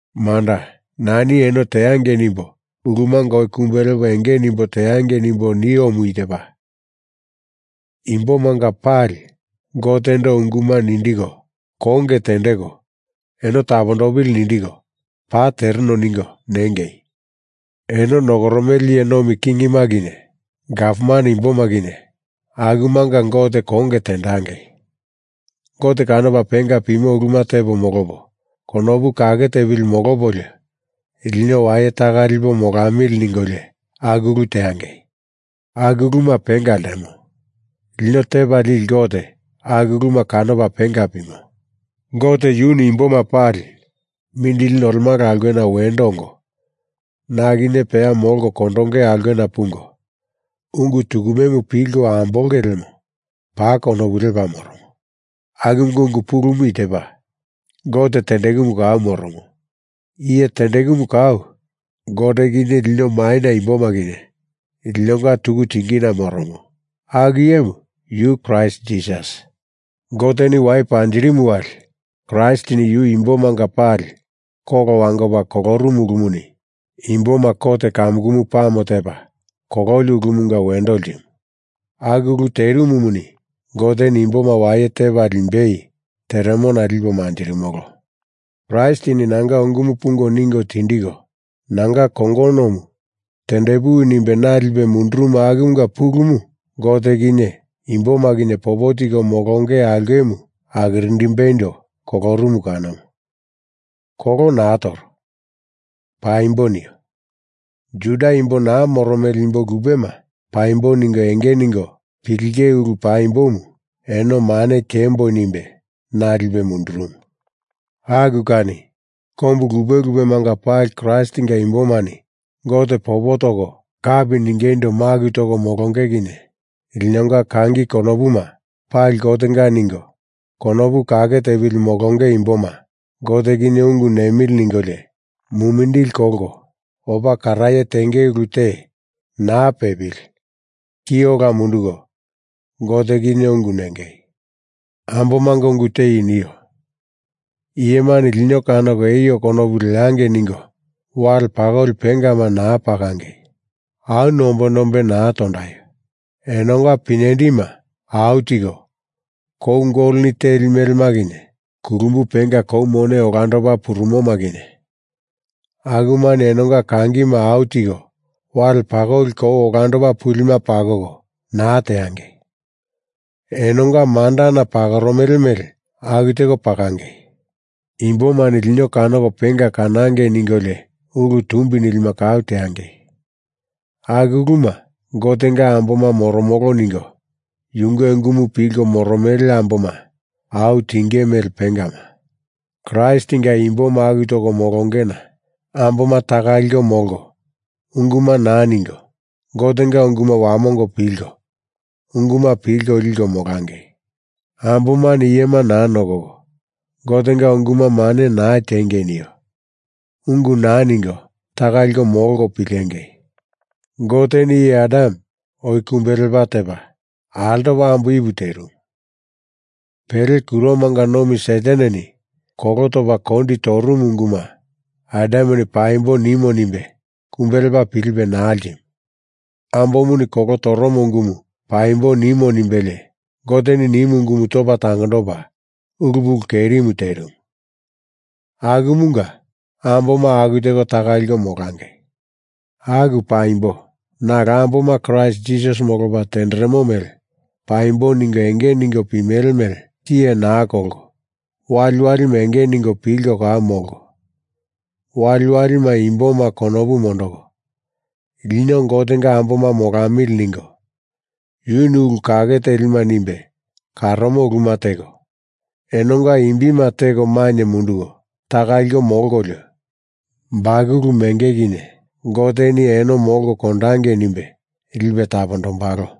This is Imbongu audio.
Manda, nani eno teangei nimbo ulumanga oi kumbe lepo enge nimbo teangei nimbo niomu i tepa, Imbomanga pali Gotendo unguma nindiko, konge tendeko, eno tapondopili nindiko, paa tereno ningo nengei. Eno nokoromele iye nomi kingima kinye gavman imboma kinye akumanga Gote konge tendangei. Gote kanopa penga pimo uluma tepo molopo konopu kake tepili molopolio lino waye taka lipo molamili ningolio aku ulu teangei. Aku uluma penga ltemo. Lino Tepa Lili Gote aku uluma kanopa penga pimo. Gote yuni imboma pali mindili nolemala aulkena wendo ongo na kinye peya molko kondonge aulkena pungo, ungu tukumemu pilko ambolonge lemo paa konopu lepa moromo. Akumunga ungu pulumu i tepa, Gote tendekumu kau moromo; iye tendekumu kau Gote kinye lino maina imboma kinye linonga tuku tingina moromo, aku iyemu yu Kraist Jisasi. Goteni wai panjirimu wali Kraistini yu imbomanga pali kolo wangopa kolorumu ulumuni imboma kot kamukumu pame tepa kololi ulumunga wendo ltimu. Aku ulu terimumuni Goteni imboma waye tepa limbei teremona lipo manjirimolo. Kraistini nanga ungumu pungo ningo tindiko, nanga kongonomu tendepuwi nimbe na lipe mundurumu akumunga pulumu Gote kinye imboma kinye popo tiko molonge aulkemu akirindimbeindo kolorumu kanomu. Kolo naa toro. Paimbo nio. Juda imbo naa moromele imbo lupema paimbo ningo enge ningo pilinge ulu paimbomu eno mane tiemboi nimbe na lipe mundurumu. Aku kani kombu lupe lupemanga pali Kraistinga imbomani Gote popo toko kapi ningeindo maku toko molonge kinye linonga kangi konopuma pali Gotenga ningo konopu kake tepili molonge imboma Gote kinye ungu nemili ningolio, mumindili kolko opa karaye tenge ulu te naa pepili ki ola munduko Gote kinye ungu nengei. Ambomanga ungu te i nio. Iyemani lino kanoko eio konopu leangei ningo wale pakoli pengama naa pakangei. Au nombe nombe naa tondaio. Enonga pinyendima au tiko, kou goloni teli melema kinye kulumbu penga kou mone olandopa purumoma kinye, akumani enonga kangima au tiko wale pakoli kou olando pulima pakoko, naa teangei. Enonga mandana pakoromele mele aku teko pakangei. Imbomani lino kanoko penga kanangei ningolio ulu tumbi nilima kau teangei. Aku uluma Gotenga amboma moromolo ningo yunge ungumu pilko moromele amboma au tinge mele pengama. Kraistinga imbo maku toko molongena amboma taka liko molko unguma naa ningo, Gotenga unguma wamongo pilko, unguma pilko liko molangei. Ambomani iyema naa nokoko, Gotenga unguma mane naa tiengei nio. Ungu naa ningo taka liko molko pilengei. Goteni iye Adam oi kumbe lepa tepa, altopa ambo Ipu terimu. Pele kuromanga nomi Sataneni kolo topa kondi torumu unguma Adameni paimbo nimo nimbe kumbe lepa pilipe naa ltimu. Ambomuni kolo toromo ungumu paimbo nimo nimbelie Goteni nimu ungumu topa tangondopa ulu pulu kerimu terimu. Akumunga amboma aku teko taka liko molangei. Aku paimbo nalo amboma Kraist Jisasi molopa tenderemo mele paimbo ningo enge ningo pimele mele tiye naa kolko waliwalima enge ningo pilko kau molko, waliwalima imboma konopu mondoko, lino Gotenga amboma molamili ningo yuni ulu kake telima nimbe karomo uluma teko, enonga imbima teko mainye munduko taka liko molkolio, bakulu menge kinye Goteni eno molko kondangei nimbe lipe tapondombalo.